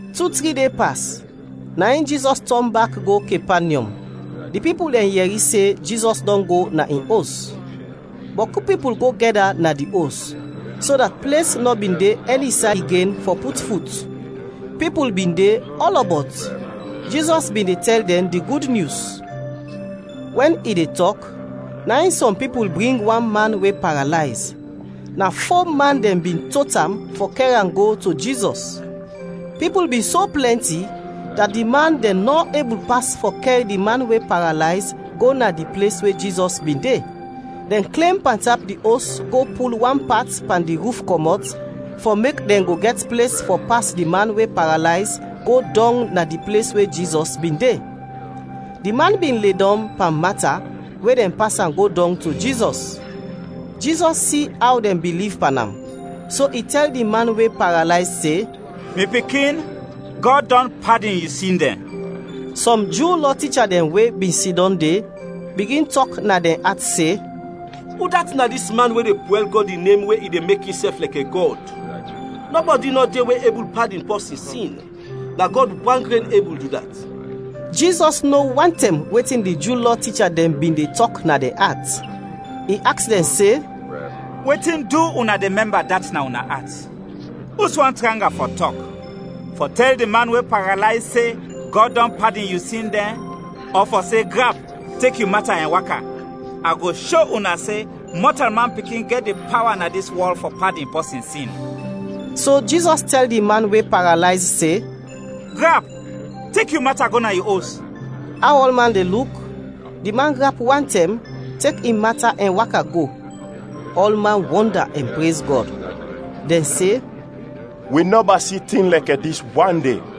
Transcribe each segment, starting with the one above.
Tu, tri de pas, na in Jizɔs tɔn bak go Kepanyɔm. Di pipul dɛn yɛri se Jizɔs dɔn go na in os. Bɔku pipul go gɛda na di os, so dat ples nɔ bin de ɛni say igen fɔ put fut; pipul bin de ɔlɔbɔt, Jizɔs bin de tɛl dɛn di Gud Nyus. Wɛn i de tɔk, na in sɔm pipul bring wan man we paralayz. Na fo man dɛn bin tot am fɔ kɛr am go to Jizɔs. Pipul bin so plɛnti dat di man dɛn nɔ ebul pas fɔ kɛr di man we paralayz go na di ples we Jizɔs bin de. Dɛn klem pantap di os go pul wan pat pan di ruf kɔmɔt fɔ mek dɛn go gɛt ples fɔ pas di man we paralayz go dɔng na di ples we Jizɔs bin de. Di man bin ledɔm pan mata we dɛn pas am go dɔng to Jizɔs. Jizɔs si aw dɛn biliv pan am, so i tɛl di man we paralayz se, “Mi pikin, Gɔd dɔn padin yu sin dɛn.” Sɔm Ju Lɔ ticha dɛn we bin sidɔm de, bigin tɔk na dɛn at se, “Udat na dis man we de pwɛl Gɔd in nem we i de mek insɛf lɛkɛ Gɔd? Nɔbɔdi nɔ de we ebul padin pɔsin sin; na Gɔd wan gren ebul du dat!” Jizɔs no wantɛm wetin di Ju Lɔ ticha dɛn bin de tɔk na dɛn at. I aks dɛn se, “Wetin du una de mɛmba dat na una at? Uswan tranga fɔ tɔk, fɔ tɛl di man we paralayz se, ‘Gɔd dɔn padin yu sin dɛn’ ɔ fɔ se ‘Grap, tek yu mata ɛn waka?’ A go sho una se Mɔtalman Pikin gɛt di pawa na dis wɔl fɔ padin pɔsin sin.” So Jizɔs tɛl di man we paralayz se, “Grap, tek yu mata, go na yu os!” Aw ɔlman de luk, di man grap wantɛm, tek in mata ɛn waka go. Ɔlman wɔnda ɛn prez Gɔd. Dɛn se, “Wi nɔba si tin lɛkɛ dis wande!”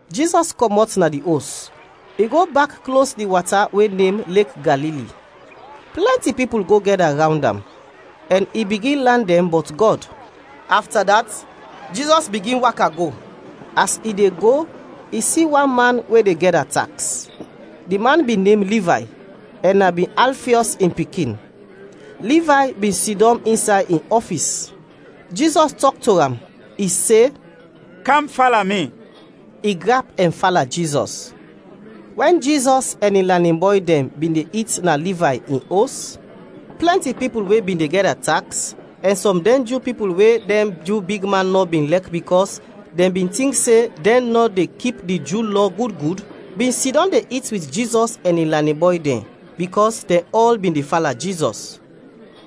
Jizɔs kɔmɔt na di os, i go bak klos di wata we nem Lek Galili. Plɛnti pipul go gɛda rawnd am, ɛn i bigin lan dɛn bɔt Gɔd. Afta dat, Jizɔs bigin waka go; as i de go, i si wan man we de gɛda taks. Di man bin nem Livay ɛn na bin Alfiɔs in pikin. Livay bin sidɔm insay in ɔfis. Jizɔs tɔk to am, i se, “Kam fala mi!” I grap ɛn fala Jizɔs. Wɛn Jizɔs ɛn in lanin bɔy dɛn bin de it na Livay in os, plɛnti pipul we bin de gɛda taks ɛn sɔm dɛn Ju pipul we dɛn Ju bigman nɔ bin lɛk bikɔs dɛn bin tink se dɛn nɔ de kip di Ju Lɔ gud gud, bin sidɔm de it wit Jizɔs ɛn in lanin bɔy dɛn, bikɔs dɛn ɔl bin de fala Jizɔs.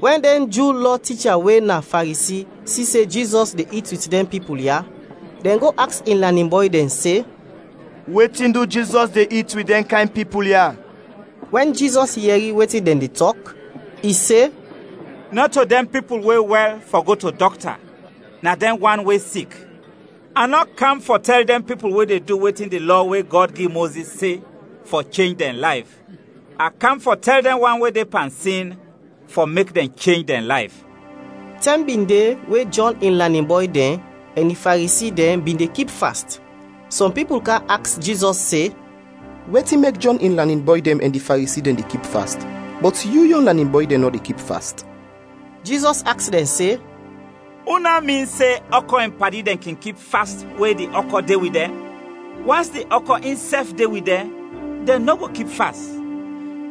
Wɛn dɛn Ju Lɔ ticha we na Faresi si se Jizɔs de it wit dɛn pipul ya, dɛn go aks in lanin bɔy dɛn se, “Wetin du Jizɔs de it wit dɛn kayn pipul ya?” Wɛn Jizɔs yɛri wetin dɛn de tɔk, i se, “Nɔto dɛn pipul we wɛl gɛt fɔ go to dɔkta, na dɛn wan we sik. A nɔ kam fɔ tɛl dɛn pipul we de du wetin di Lɔ we Gɔd gi Mozis se, fɔ chenj dɛn layf, a kam fɔ tɛl dɛn wan we de pan sin fɔ mek dɛn chenj dɛn layf.” Tɛm bin de we Jɔn in lanin bɔy dɛn ɛn di Faresi dɛn bin de kip fast. Sɔm pipul kam aks Jizɔs se, “Wetin mek Jɔn in lanin bɔy dɛn ɛn di Faresi dɛn de kip fast, bɔt yu yon lanin bɔy dɛn nɔ de kip fast?” Jizɔs aks dɛn se, “Una min se, ɔkɔ in padi dɛn kin kip fast we di ɔkɔ de wit dɛn? Wans di ɔkɔ insɛf de wit dɛn, dɛn nɔ go kip fast.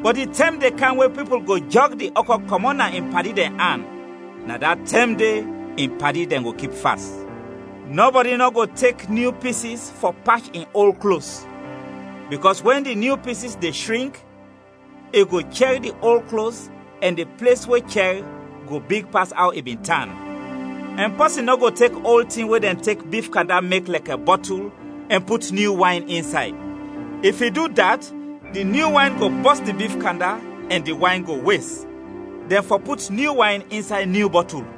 Bɔt di tɛm de kam we pipul go jɔg di ɔkɔ kɔmɔt na in padi dɛn an, na da tɛm de in padi dɛn go kip fast. “Nɔbɔdi nɔ go tek nyu pisis fɔ pach in ol klos, bikɔs wɛn di nyu pisis de shrink, i go chɛr di ol klos ɛn di ples we chɛr go big pas aw i bin tan. Ɛn pɔsin nɔ go tek ol tin we dɛn tek bif kanda mek lɛkɛ bɔtul ɛn put nyu wayn insay, if i du dat, di nyu wayn go bɔs di bif kanda ɛn di wayn go wes. Dɛn fɔ put nyu wayn insay nyu bɔtul.”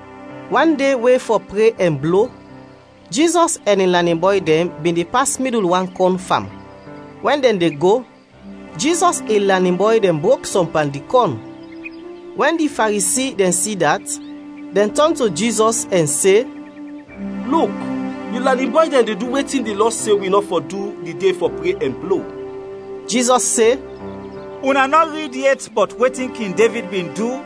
Wan de we fɔ pre ɛn blo, Jizɔs ɛn in lanin bɔy dɛn bin de pas midul wan kɔn fam; wɛn dɛn de go, Jizɔs in lanin bɔy dɛn brok sɔm pan di kɔn. Wɛn di Faresi dɛn si dat, dɛn tɔn to Jizɔs ɛn se, “Luk, yu lanin bɔy dɛn de du wetin di Lɔ se wi nɔ fɔ du di de fɔ pre ɛn blo.” Jizɔs se, “Una nɔ rid yet bɔt wetin King Devid bin du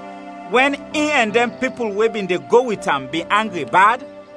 wɛn in ɛn dɛn pipul we bin de go wit am bin angri bad?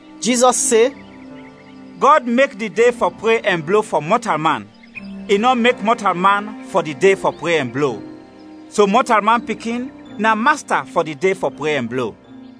Jizɔs se, “Gɔd mek di de fɔ pre ɛn blo fɔ mɔtalman, i nɔ mek mɔtalman fɔ di de fɔ pre ɛn blo. So Mɔtalman Pikin na Masta fɔ di de fɔ pre ɛn blo.”